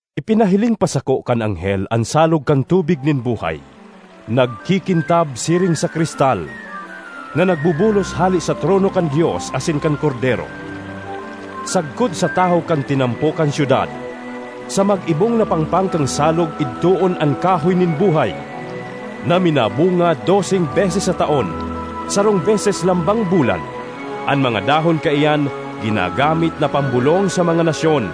Ipinahiling pa sako kan anghel an salog kan tubig nin buhay, nagkikintab siring sa kristal, na nagbubulos hale sa trono kan Dios asin kan Kordero, sagkod sa tahaw kan tinampo kan syudad. Sa mag-ibong na pangpang kan salog idtoon an kahoy nin buhay, na minabunga doseng beses sa taon, sarong beses lambang bulan. An mga dahon kaiyan ginagamit na pambulong sa mga nasyon.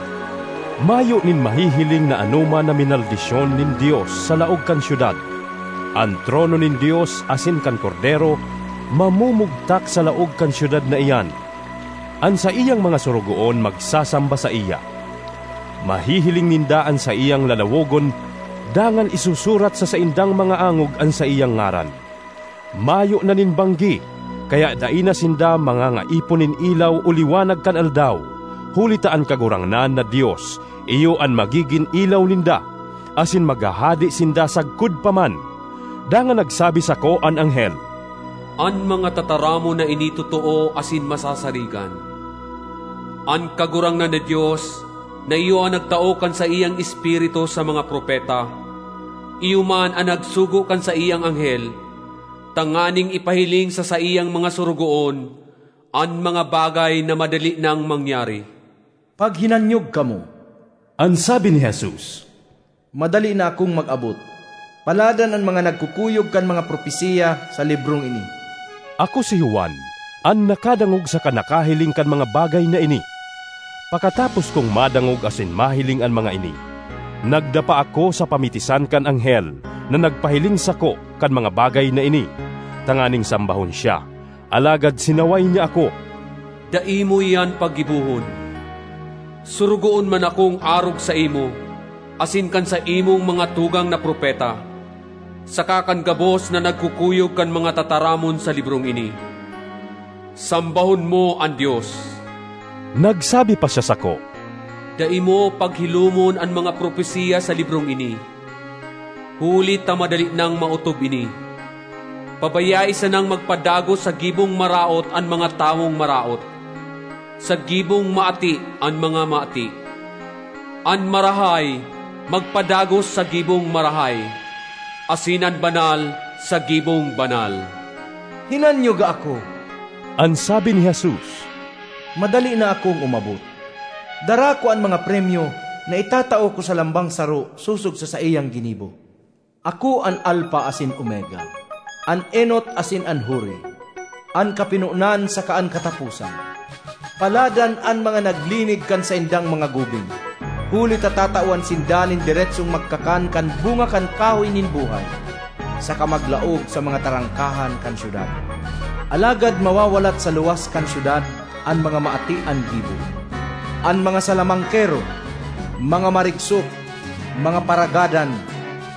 Mayo nin mahihiling na anoman na minaldisyon nin Dios sa laog kan syudad. An trono nin Dios asin kan Kordero mamumugtak sa laog kan syudad na iyan; an saiyang mga sorogoon magsasamba saiya. Mahihiling ninda an saiyang lalawogon dangan isusurat sa saindang mga angog an saiyang ngaran. Mayo na nin banggi, kaya dai na sinda mangangaipo nin ilaw o liwanag kan aldaw, huli ta an Kagurangnan na Dios iyo an magigin ilaw ninda, asin maghahade sinda sagkod pa man. Dangan nagsabi sako an anghel, “An mga tataramon na ini totoo asin masasarigan. An Kagurangnan na Dios, na iyo an nagtao kan saiyang Espiritu sa mga propeta, iyo man an nagsugo kan saiyang anghel tanganing ipahiling sa saiyang mga sorogoon an mga bagay na madali nang mangyari.” ”Paghinanyog kamo!” an sabi ni Jesus. “Madali na akong mag-abot! Paladan an mga nagkukuyog kan mga propesiya sa librong ini!” Ako, si Juan, an nakadangog saka nakahiling kan mga bagay na ini. Pakatapos kong madangog asin mahiling an mga ini, nagdapa ako sa pamitisan kan anghel na nagpahiling sako kan mga bagay na ini, tanganing sambahon siya. Alagad sinaway niya ako, “Dai mo iyan paggibohon! Sorogoon man akong arog saimo asin kan saimong mga tugang na propeta saka kan gabos na nagkukuyog kan mga tataramon sa librong ini. Sambahon mo an Dios!” Nagsabi pa siya sako, “Dai mo paghilomon an mga propesiya sa librong ini, huli ta madali nang maotob ini. Pabayae sanang magpadagos sa gibong maraot an mga tawong maraot; sa gibong maati an mga maati; an marahay, magpadagos sa gibong marahay; asin an banal, sa gibong banal.” ”Hinanyoga ako!” an sabi ni Jesus. “Madali na akong umabot! Dara ko an mga premyo na itatao ko sa lambang saro sosog sa saiyang ginibo. Ako an Alfa asin Omega, an enot asin an huri, an kapinonan saka an kataposan.” Paladan an mga naglinig kan saindang mga gubing, huli ta tatawan sinda nin deretsong magkakan kan bunga kan kahoy nin buhay, saka maglaog sa mga trangkahan kan syudad. Alagad mawawalat sa luwas kan syudad an mga maati an gibo, an mga salamangkero, mga marigsok, mga paragadan,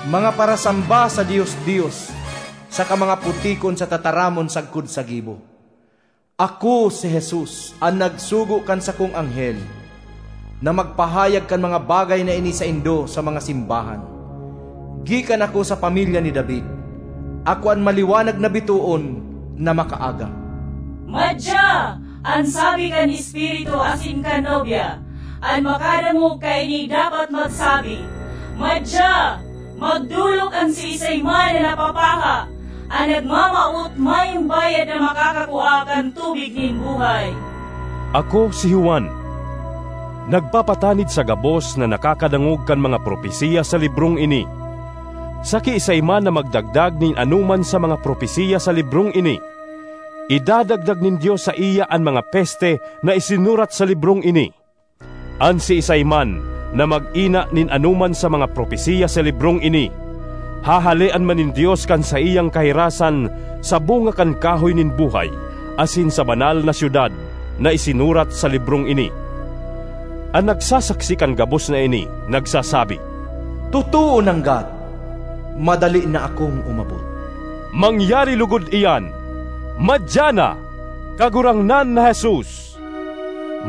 mga parasamba sa dios-dios saka mga putikon sa tataramon sagkod sa gibo. ”Ako, si Jesus, an nagsugo kan sakong anghel na magpahayag kan mga bagay na ini saindo sa mga simbahan. Gikan ako sa pamilya ni David; ako an maliwanag na bitoon na makaaga.” ”Madya!” an sabi kan Espiritu asin kan Nobya. An makadangog kaini dapat man magsabi, “Madya!” Magdolok an siisay man na napapaha; an nagmamawot, mayong bayad na makakakua kan tubig nin buhay. Ako, si Juan, nagpapatanid sa gabos na nakakadangog kan mga propesiya sa librong ini: sa kiisay man na magdagdag nin anoman sa mga propesiya sa librong ini, idadagdag nin Dios saiya an mga peste na isinurat sa librong ini. An siisay man na mag-ina nin anoman sa mga propesiya sa librong ini, hahalean man nin Dios kan saiyang kahirasan sa bunga kan kahoy nin buhay asin sa Banal na Syudad na isinurat sa librong ini. An nagsasaksi kan gabos na ini nagsasabi, “Totoo nanggad! Madali na akong umabot!” Mangyari logod iyan. Madya na, Kagurangnan na Jesus!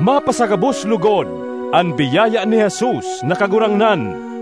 Mapasagabos logod an biyaya ni Jesus na Kagurangnan.